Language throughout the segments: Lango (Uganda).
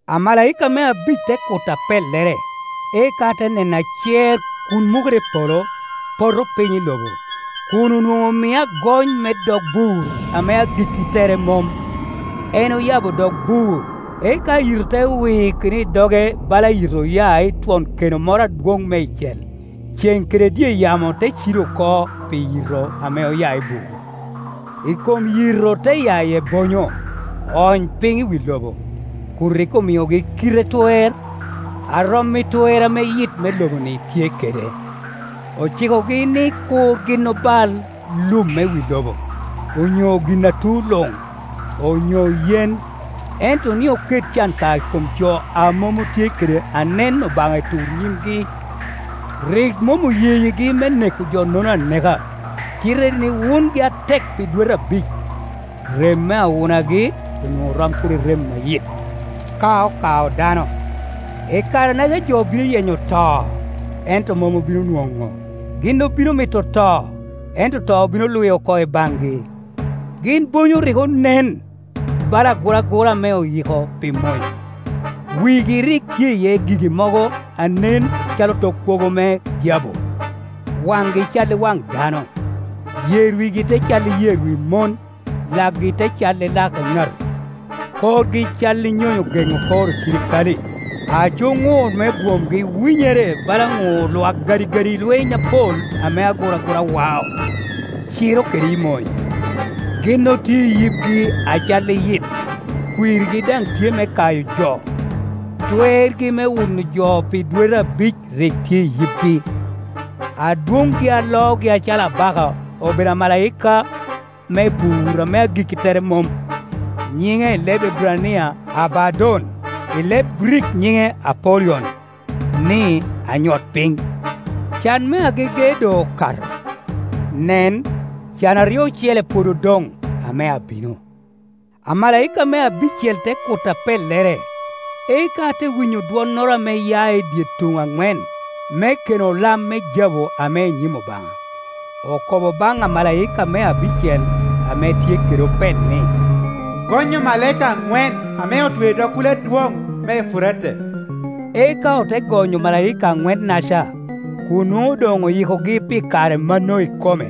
Amalaika me abic te kuto apellere, eka ate neno acer kun mukere i polo, poto piny i lobo, kun onwoŋo omie agony me dog bur ame agikki tere mom. En oyabo dog bur, eka yito te wikino i doge bala yito oya i twon keno moro adwoŋ meicel, ceŋ kede dye yamo te cido oko pi yito ame oya i bur. I kom yito te ya iye bonyo, oony piny i wi lobo, kun rik omiogi kite twer a rom i twer ame yit me lobo-ni tye kede. Ocikogi ni kur gin obal lum me wi lobo, onyo gin a tu luŋ, onyo yen, ento ni oket can ka i kom jo a mom otye kede anen Obaŋa i tur nyimgi. Rik mom oyeyigi me neko jo-nono aneka, cite ni wungi atek pi dwete abic. Rem me awunagi onwoŋo rom kede rem a yit, ka okao dano. I kare-naca jo bino yenyo to, ento mom obino nwoŋo; gin obino mito to, ento to bino lwi oko i baŋgi. Gin bonyo rik onen bala aguragura ame oyiko pi mony; wigi rik tye iye gigi mogo a nen calo tok kwogo me jabu; waŋgi cal i waŋ dano, yer wigi te cal i yer wi mon, lakgi te cal i lak eŋato. Korgi cal i nyonyo geŋo kor ocirikale, aco ŋur me bwomgi winyere bala ŋur lwak gadigadi lweny apol ame aguragura wao, ciro kede i mony. Gin otye i yibgi acalli yit, kwirgi daŋ tye me kayo jo; twergi me wuno jo pi dwete abic rik tye i yibgi. Adwoŋgi a loogi acalo abaka obedo amalaika me bur ame agikki tere mom. Nyiŋe i leb Eburania Abaddon; i leb Grik nyiŋe Apollyon (ni: Anyot-piny). Can me agege doŋ okato. Nen, can aryo ocele pwod odoŋ, ame abino. Amalaika me abicel te kuto apellere, eka ate winyo dwonnoro ame ya i dye tuŋ aŋwen me keno lam me jabu ame i nyim Obaŋa. Okobo baŋ amalaika me abicel, ame tye kede opel ni, “Gony omalaika aŋwen ame otweo i dog kulo adwoŋ me Efurate.” Eka ote gonyo omalaika anwennaca, kun nwoŋo doŋ oyikogi pi kare mano ikome,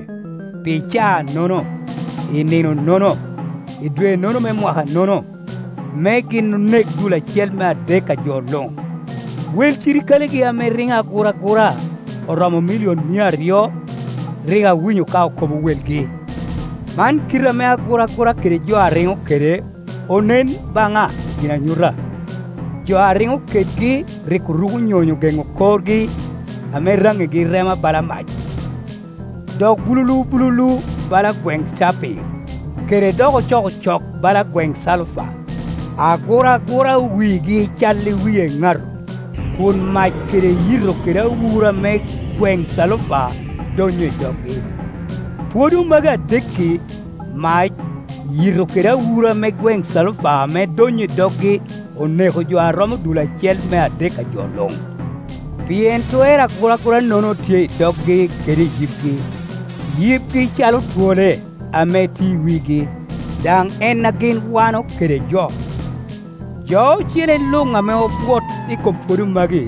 pi caa-nono, i nino-nono, i dwe-nono me mwaka-nono, me gin onek dul acel me adek a jo luŋ. Wel cirikalegi ame riŋo aguragura oromo milion mia aryo; rik awinyo ka okobo welgi. Man kite ame aguragura kede jo a riŋo kede onen baŋa i ginanyuta: jo a riŋo kedgi rik oruko nyonyo geŋo korgi ame raŋigi rema bala mac, dok bululu bululu bala gweŋ capir, kede dok ocokocok bala gweŋ calufa. Aguragura wigi cal i wi eŋato, kun mac kede yito kede awura me gweŋ calufa donnyo i doggi. Pwodo magi adek-ki, mac, yito kede awura ame gweŋ calufa ame donnyo i doggi oneko jo a romo dul acel me adek a jo luŋ. Pien twer aguragura-nono tye i doggi kede i yibgi. Yibgi calo twole, ame tye i wigi, daŋ en a gin wano kede jo. Jo ocele luŋ ame obwot i kom pwodo magi,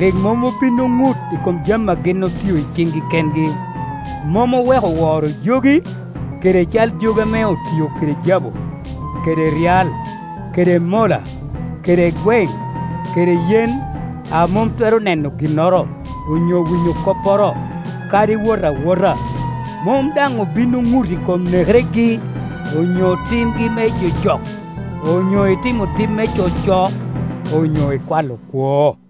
rik mom obin oŋut i kom jami a gin otio i ciŋgi kengi, mom oweko woro jogi, kede cal jogi ame otio kede jabu, kede ryal, kede mola, kede gweŋ, kede yen, a mom twero neno ginnoro, onyo winyo kopporo, kadi wot awota. Mom daŋ obin oŋut i kom nekeregi, onyo timgi me jojok, onyo i timo tim me coco, onyo i kwalo kwo.